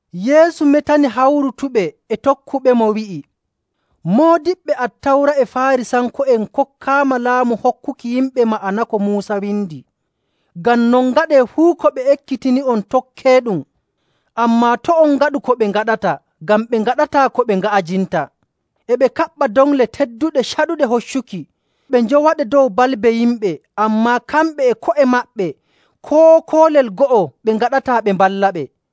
Yeesu metani hawrutuɓe e tokkuɓemo, wi'i, “Moodiɓɓe Attawra e Faarisanko'en kokkaama laamu hokkuki yimɓe ma'ana ko Muusa windi. Ngam non, ngaɗee fuu ko ɓe ekkitini'on tokkeeɗum, ammaa to' on ngaɗu ko ɓe ngaɗata, ngam ɓe ngaɗataa ko ɓe nga'ajinta. E ɓe kaɓɓa doŋle tedduɗe caɗuɗe hoccuki, ɓe njowaɗe dow balbe yimɓe, ammaa kamɓe e ko'e maɓɓe koo koolel go'o ɓe ngaɗataa ɓe mballaɓe.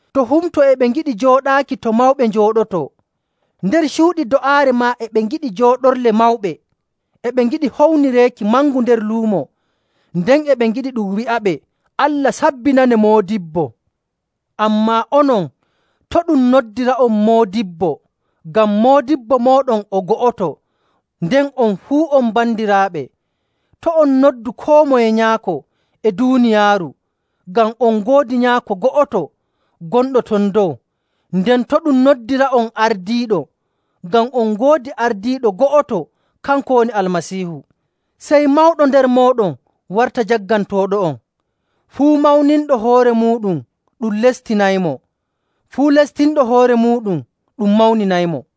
To humto e ɓe ngiɗi jooɗaaki to mawɓe njooɗotoo; nder cuuɗi do'aare maa e ɓe ngiɗi jooɗorle mawɓe. E ɓe ngiɗi hownireeki mangu nder luumo, nden e ɓe ngiɗi ɗum wi'aɓe, ‘Allah sabbinanee, Moodibbo.’ Ammaa onon, to' ɗum noddira'on ‘Moodibbo,’ ngam Moodibbo mooɗon o go'oto, nden on fuu on bandiraaɓe. To' on noddu koo moye ‘Nyaako’ e duuniyaaru, ngam on ngoodi Nyaako go'oto, gonɗo ton dow. Nden to' ɗum noddira'on ‘Ardiiɗo,’ ngam on ngoodi Ardiiɗo go'oto, kanko woni Almasiihu. Sey mawɗo nder mooɗon warta jaggantooɗo'on.. Fuu mawninɗo hoore muuɗum ɗum lestinaymo. Fuu lestinɗo hoore muuɗum ɗum mawninaymo..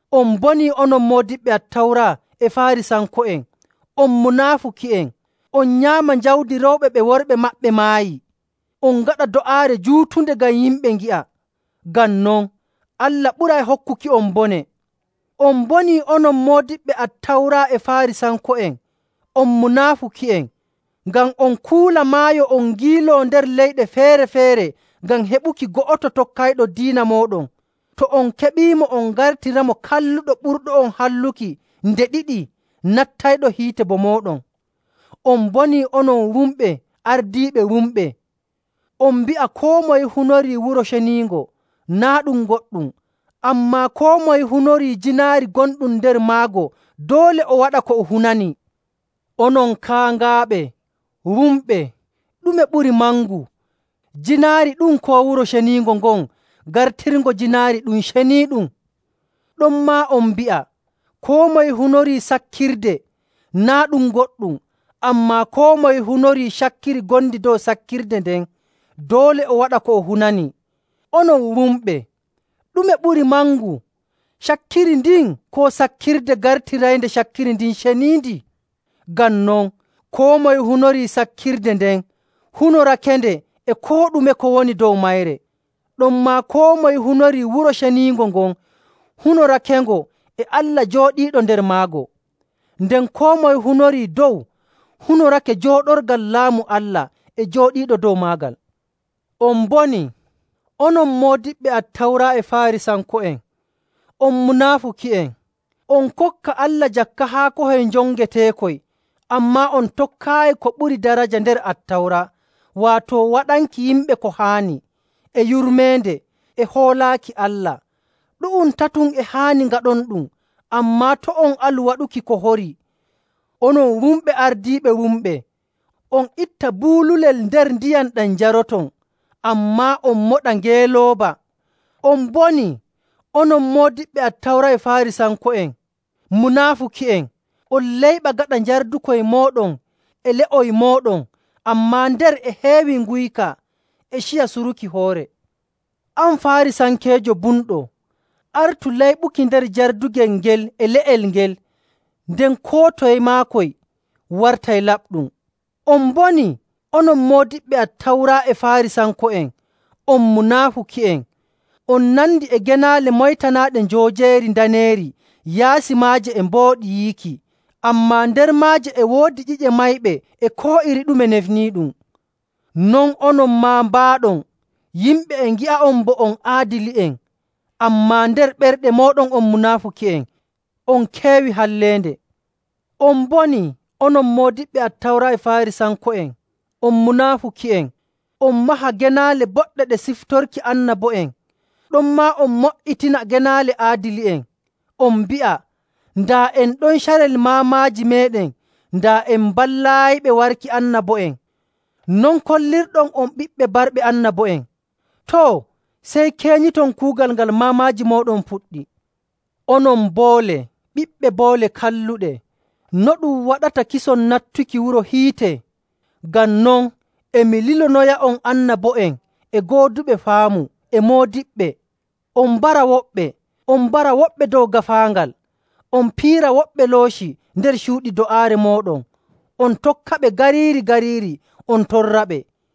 [On mbonii onon moodiɓɓe Attawra e Faarisanko'en! On munaafuki'en! On nyaama jawdi rewɓe ɓe worɓe maɓɓe maayi, on ngaɗa do'aare juutunde ngam yimɓe ngi'a. Ngam non, Allah ɓuray hokkuki'on bone.] “On mbonii, onon moodiɓɓe Attawra e Faarisanko'en! On munaafuki'en! Ngam on kuula maayo on ngiiloo nder leyɗe feere‑feere ngam heɓuki go'oto tokkayɗo diina mooɗon. To on keɓiimo, on ngartiramo kalluɗo ɓurɗo'on halluki nde ɗiɗi nattayɗo hiite bo mooɗon. “On mbonii, onon wumɓe ardiiɓe wumɓe! On mbi'a, ‘Koo moye hunorii Wuro Ceniingo, naa' ɗum goɗɗum. Ammaa koo moye hunorii jiinaari gonɗum nder maago, doole o waɗa ko o hunanii.’ Onon kaaŋaaɓe, wumɓe! Ɗume ɓuri mangu, jiinaari ɗum, koo Wuro Ceniingo ngon gartirngo jiinaari ɗum ceniiɗum? Ɗonmaa on mbi'a, ‘Koo moye hunorii sakkirde, naa' ɗum goɗɗum. Ammaa koo moye hunorii cakkiri ngondi dow sakkirde nden, doole o waɗa ko o hunanii.’ Onon wumɓe! Ɗume ɓuri mangu, cakkiri ndin, koo sakkirde gartiraynde cakkiri ndin ceniindi? Ngam non, koo moye hunorii sakkirde nden hunorakende e koo ɗume ko woni dow mayre. Ɗonmaa koo moye hunorii Wuro Ceniingo ngon hunorakengo e Allah jooɗiiɗo nder maago. Nden koo moye hunorii dow, hunorake jooɗorgal laamu Allah e jooɗiiɗo dow maagal.. “On mbonii, onon moodiɓɓe Attawra e Faarisanko'en! On munaafuki'en! On kokka Allah jakka haakohoy njongeteekoy, ammaa on tokkaayi ko ɓuri daraja nder Attawra, waato waɗanki yimɓe ko haani, e yurmeende, e hoolaaki Allah. Ɗu'um tatum e haani ngaɗonɗum, ammaa to' on alu waɗuki ko horii.. Onon wumɓe ardiiɓe wumɓe! On itta buululel nder ndiyam ɗam njaroton, ammaa on moɗa ngeelooba! “On mbonii, onon moodiɓɓe Attawra e Faarisanko'en, munaafuki'en! On layɓa gaɗa njardukoy mooɗon e le'oy mooɗon, ammaa nder e heewi nguyka e ciya suruki hoore. An Faarisankeejo bumɗo! Artu layɓuki nder jardugel ngel e le'el ngel, nden koo toye maakoy wartay laɓɗum. “On mbonii, onon moodiɓɓe Attawra e Faarisanko'en! On munaafuki'en! On nandi e genaale moytanaaɗe njoojeeri ndaneeri yaasi maaje e mbooɗi yiiki, ammaa nder maaje e woodi ƴi'e mayɓe e koo iri ɗume nefniiɗum.. Non onon maa mbaaɗon. Yimɓe e ngi'a'on bo on aadili'en, ammaa nder ɓerɗe mooɗon on munaafuki'en on keewii halleende. “On mbonii, onon moodiɓɓe Attawra e Faarisanko'en! On munaafuki'en! On maha genaale boɗɗe ɗe siftorki annabo'en, ɗonmaa on mo''itina genaale aadili'en. On mbi'a, ‘Daa en ɗon carel maamaaji meeɗen, daa en mballaayiɓe warki annabo'en.’ Non kollirɗon on ɓiɓɓe barɓe annabo'en. Too, sey keenyiton kuugal ngal maamaaji mooɗon puɗɗi! Onon boole, ɓiɓɓe boole kalluɗe! No ɗum waɗata kison nattuki wuro hiite?. Ngam non, e mi lilonoya'on annabo'en e gooduɓe faamu e moodiɓɓe. On mbara woɓɓe, on mbara woɓɓe dow gaafaangal, on piira woɓɓe looci nder cuuɗi do'aare mooɗon, on tokkaɓe gariiri‑gariiri on torraɓe.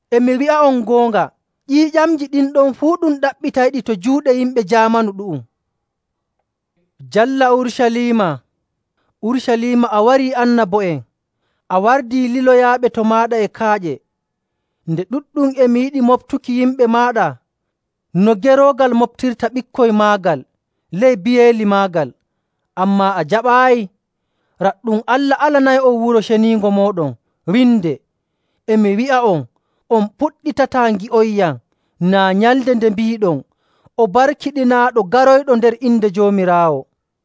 E mi wi'a'on goonga, ƴiiƴamji ɗin ɗon fuu ɗum ɗaɓɓitayɗi to juuɗe yimɓe jaamanu ɗu'um. “Jalla Urucaliima, Urucaliima a warii annabo'en, a wardii liloyaaɓe to maaɗa e kaaƴe! Nde ɗuɗɗum e mi yiɗi moɓtuki yimɓe maaɗa no geroogal moɓtirta ɓikkoy maagal ley biyeeli maagal, ammaa a jaɓaayi. Raɗɗum, Allah alanay'on Wuro Ceniingo mooɗon winde.. E mi wi'a'on, on puɗɗitataa ngi'onyam, naa nyalnde nde mbiiɗon, ‘O barkiɗinaaɗo, garoyɗo nder inde Joomiraawo.’”.